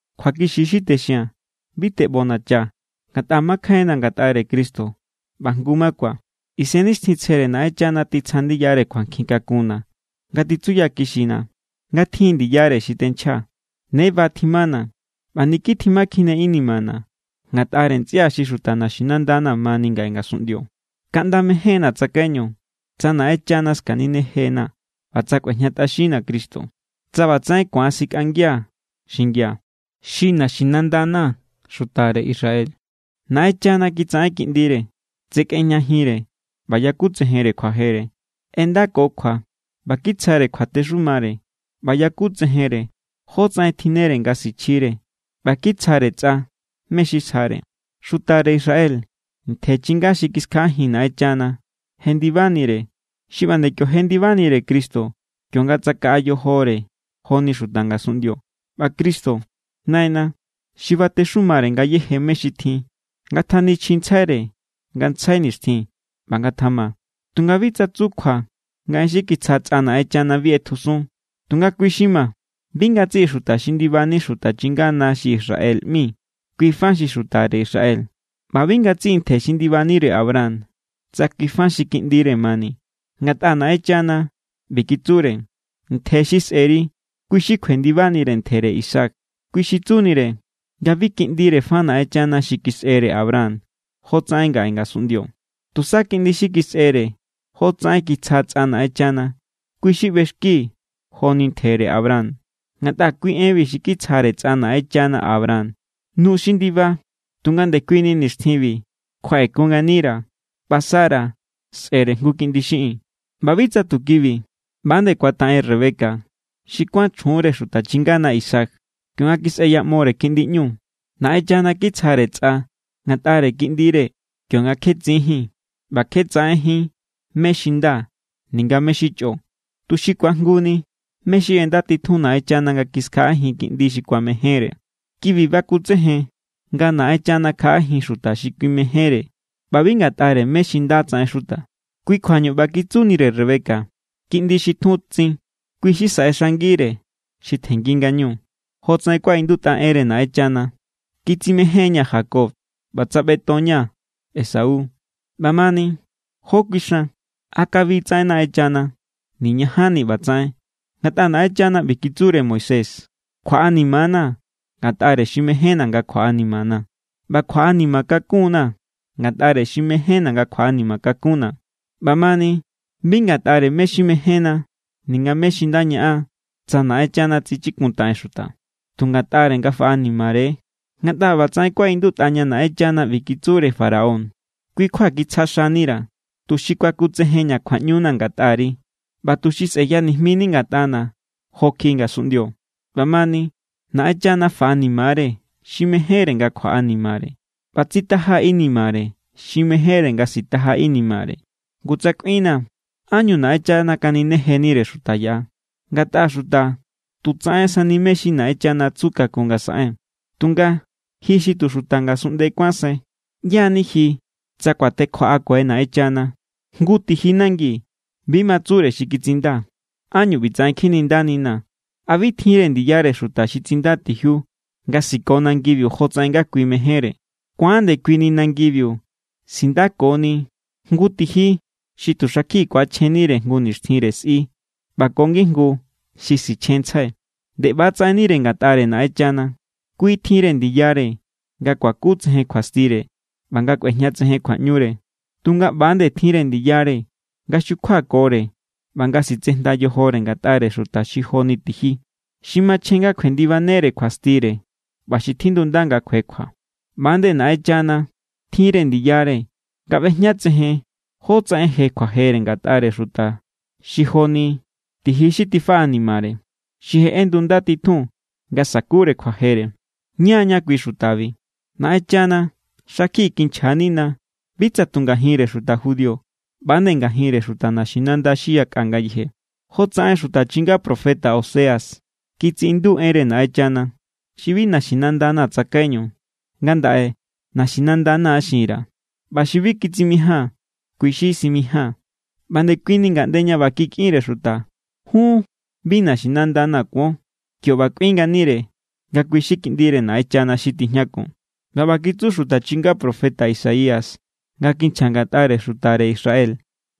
Kjuakixi= xi texia̱n. Bi teꞌbonachaa̱ ngatꞌa makjainna̱ ngatꞌare Cristo ꞌba jngu= makuaa̱. Isennixtjintsjere Naꞌenchana titsja ndiyare kjuankjin kakunna̱ nga titsuyakixina̱ nga tjin= ndiyare xi tenchjaa̱. Ne ba tjimana̱ ꞌba niki tjimakjine inimana̱ ngatꞌare ntsꞌia xi xuta naxinandana̱ mani ngaꞌe ngasunꞌndio. Kaꞌnda mejénna̱ tsakaiñu tsa Naꞌenchana skaninejena̱ ꞌba tsa kꞌuejñatꞌaxinna̱ Cristo, tsa ꞌbatsaꞌen ku̱an sikꞌangia̱ xingia̱. Xi naxinandana̱ xutare Israel. Naꞌenchana kitsaꞌen kiꞌndire. Tsekꞌejñajinre ꞌba yakutsejenre kjuajere. ꞌEndako kjua ꞌba kitsjare kjuatexumare ꞌba yakutsejenre jótsaꞌen tjinnere nga sichjire ꞌba kitsjare tsꞌa mé= xi sjare. Xutare Israel ntje chinga xi kiskjaꞌajin Naꞌenchana jendibanire. Xi ꞌba nde kio jendibanire Cristo kionga tsakaꞌa yojore joni xuta ngasunꞌndio. ꞌBa Cristo, Naina xi batexumare ngayéje mé= xi tjin. Ngatjanichjintsjaire ngantsjai nixtjin. ꞌBa ngatjama. Tunga bi tsa tsu kjua nga en xi kitsja tsꞌa Naꞌenchana bi ꞌetjusun. Tunga kui= xi ma, bi ngatsiꞌi xuta xi ndibani xuta chingana xi Israel ꞌmi, kui fa xi xutare Israel. ꞌBa bi ngatsiꞌi ntje xi ndibanire Abraham, tsa kui fa xi kiꞌndire mani. Ngatꞌa Naꞌenchana ꞌbi kitsure: “Ntje xi sꞌe̱ri, kui= xi kjuendibanire ntjere Isaac.” Kui xi tsunire nga bi kiꞌndire fa Naꞌenchana xi kisꞌere Abraham jotsaꞌen ngaꞌe ngasunꞌndio. Tusa kiꞌndi xi kisꞌere jotsaꞌen kitsja tsꞌa Naꞌenchana, kui= xi ꞌbexki joni ntjere Abraham. Ngatꞌa kui enbi xi kitsjare tsꞌa Naꞌenchana Abraham: “Nu xi ndiba tunga ndekuini nixtjinbi kjuaꞌekun nganira̱, ꞌba Sara sꞌe̱re jngu kiꞌndi xiꞌin.” ꞌBa bi tsa tu kibi. ꞌBa=nde kuataꞌen Rebeca xi kuán chjunre xuta chingana Isaac, kionga kisꞌeyaꞌmore kiꞌndi ꞌñu. Naꞌenchana kitsjare tsꞌa ngatꞌare kiꞌndire kionga kje tsinjín ꞌba kje tsaꞌenjín mé= xi nda ninga mé= xi chꞌo, tuxi ku̱ajnguni mé= xi ꞌendatitjun Naꞌenchana nga kiskjaꞌajin kiꞌndi xi kuamejénre. Kibi bakutsejen nga Naꞌenchana kjaꞌajin xuta xi kui mejénre ꞌba bi ngatꞌare mé= xi nda tsaꞌen xuta. Kui kjuañu ꞌba kitsunire Rebeca: “Kiꞌndi xi tjun tsin, kui= xi saꞌexangire xi tjenngi ngañu.” Jotsaꞌen kuaꞌindutꞌa enre Naꞌenchana: “Kitsimején=ña̱ Jacob ꞌba tsaꞌbeton=ña̱ Esau.” ꞌBamani, ¿jó kuixan? ¿A kabi tsaꞌen Naꞌenchana? ¡Niñajanni ꞌbatsaꞌen! Ngatꞌa Naꞌenchana ꞌbi kitsure Moisés: “Kjuaꞌanima=na̱ ngatꞌare xi mejénna̱ nga kjuaꞌanimana̱, ꞌba kjuaꞌanima kakun=na̱ ngatꞌare xi mejénna̱ kjuaꞌanima kakuna̱.” ꞌBamani bi ngatꞌare mé= xi mejénna ninga mé= xi nda ñaꞌan tsa Naꞌenchana tsichikuntaꞌen xuta, tu ngatꞌare nga faꞌanimare=. Ngatꞌa ꞌbatsaꞌen kuaꞌindutꞌa ña Naꞌenchana ꞌbi kitsure Faraón: “Kui= kjua kitsja xanira̱, tuxi kuakutsejenña̱ kjuaꞌñuna̱ ngatꞌari ꞌba tuxi sꞌeyanijmini ngatꞌana̱ jo kjiꞌi ngasunꞌndio.” ꞌBamani Naꞌenchana faꞌanima=re xi mejénre nga kjuaꞌanimare, ꞌba tsitaja= inimare xi mejénre nga sitaja= inimare. Ngu tsa kꞌuinnaa̱: “¿Ánñu Naꞌenchana kaninejenire xuta yaꞌa? Ngatꞌa xuta tu tsaꞌensani mé= xi Naꞌenchana tsu kakun nga saꞌen.” Tunga, ji xi tu xuta ngasunꞌnde kuánsai, ¿ꞌyá= ni ji tsa kuatekjoꞌakue Naꞌenchana? Jngu tiji nangi bi ma tsure xi kitsinda: “¿Ánñu ꞌbitsaꞌen kjinindaninaa̱?” ¿A bi tjinre ndiyare xuta xi tsinda tijiu nga siko nangibiu jotsaꞌen nga kui mejénre? Ku̱an ndekui ni nangibiu sindakoni jngu tiji xi tu xakjiꞌi ku̱achjennire jngu nixtjinre sꞌi ꞌba ko ngijngu xi sichjenntsjai. Nde ꞌba= tsaꞌennire ngatꞌare Naꞌenchana. Kui tjinre ndiyare nga kuakutsejen kjuastire ꞌba nga kꞌuejñatsejen kjuaꞌñure. Tunga ꞌba= nde tjinre ndiyare nga xjukjuakore ꞌba nga sitsejnda yojore ngatꞌare xuta xi joni tiji, xi machjen nga kjuendibanere kjuastire ꞌba xi tjindunda nga kjuekjua. ꞌBa=nde Naꞌenchana tjinre ndiyare nga ꞌbejñatsejen jótsaꞌen je kjuajere ngatꞌare xuta xi jo=ni tiji xi tifaꞌanimare, xi je ꞌendunda titjun nga sa̱kure kjuajere. Ña= ña kui xutabi. Naꞌenchana xakjiꞌi kinchja=nina bi tsa tu ngajinre xuta judío, ꞌba=nde ngajinre xuta naxinanda xi yakꞌa ngayeje. Jotsaꞌen xuta chinga profeta Oseas kitsiꞌindu enre Naꞌenchana: Xi bi naxinandana̱ tsakaiñu, ngandaꞌe naxinandana̱ xin_ra̱. ꞌBa xi bi kitsimijáa̱n, kui= xi simijáa̱n. ꞌBa ndekuini ngaꞌnde ña ꞌba kikꞌinre xuta: “Jun bi naxinandana̱ kuon”, kio ꞌba kꞌuin nganire nga kui= xi kiꞌndire Naꞌenchana xi tijñakun. ꞌBa ꞌba kitsu xuta chinga profeta Isaías nga kinchja ngatꞌare xutare Israel: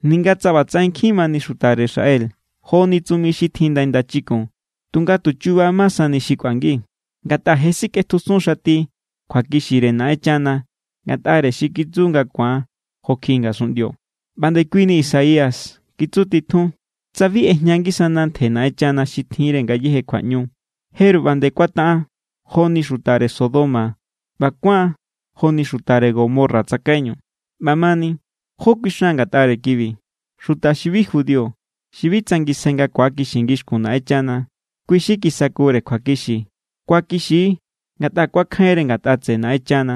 “Ninga tsa ꞌbatsaꞌen nkjin mani xutare Israel joni tsumi xi tjin ndai ndachikun, tunga tu chuba ma sani xi kꞌuangi. Ngatꞌa je sikꞌetjusun xati kjuakixire Naꞌenchana ngatꞌare xi kitsu nga ku̱an jo kjiꞌi ngasunꞌndio.” ꞌBa ndekuini Isaías kitsutitjun: “Tsa bi ꞌejña ngisana ntje Naꞌenchana xi tjinre ngayéje kjuaꞌñu, jeru ꞌba nde kuataꞌan joni xutare Sodoma ꞌba kuáan joni xutare Gomorra tsakaiñu.” ꞌBamani, ¿jó kuixan ngatꞌare kibi? Xuta xi bi judío, xi bi tsangisjai nga ku̱akixi ngixkun Naꞌenchana, kui= xi kisakure kjuakixi. Kuakixi= ngatꞌa kuakjainre ngatꞌa tseꞌe Naꞌenchana.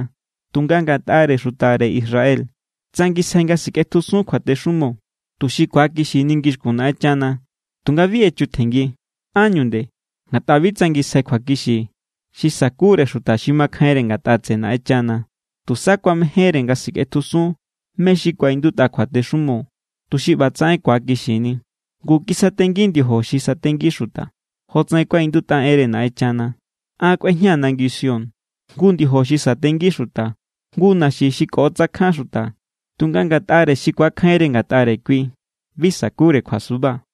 Tunga ngatꞌare xutare Israel, tsangisjai nga sikꞌetjusun kjuatexumo tuxi ku̱akixini ngixkun Naꞌenchana, tunga bi echutjenngi. ¿Ánñu nde? Ngatꞌa bi tsangisjai kjuakixi xi sakure xuta xi makjainre ngatꞌa tseꞌe Naꞌenchana. Tusa kuamejénre nga sikꞌetjusun mé= xi kuaꞌindutꞌa kjuatexumo, tuxi ꞌbatsaꞌen ku̱akixini. Ngu, kisatengi ndiojo xi satengi xuta, jotsaꞌen kuaꞌindutꞌa enre Naꞌenchana: “An kꞌuejñaa̱ nangi Sión jngu ndiojo xi satengi xuta, jngu naxi xi koꞌotsakjan xuta. Tunga ngatꞌare xi ku̱akjainre ngatꞌare kui, bi sa̱kure kjuasuba.”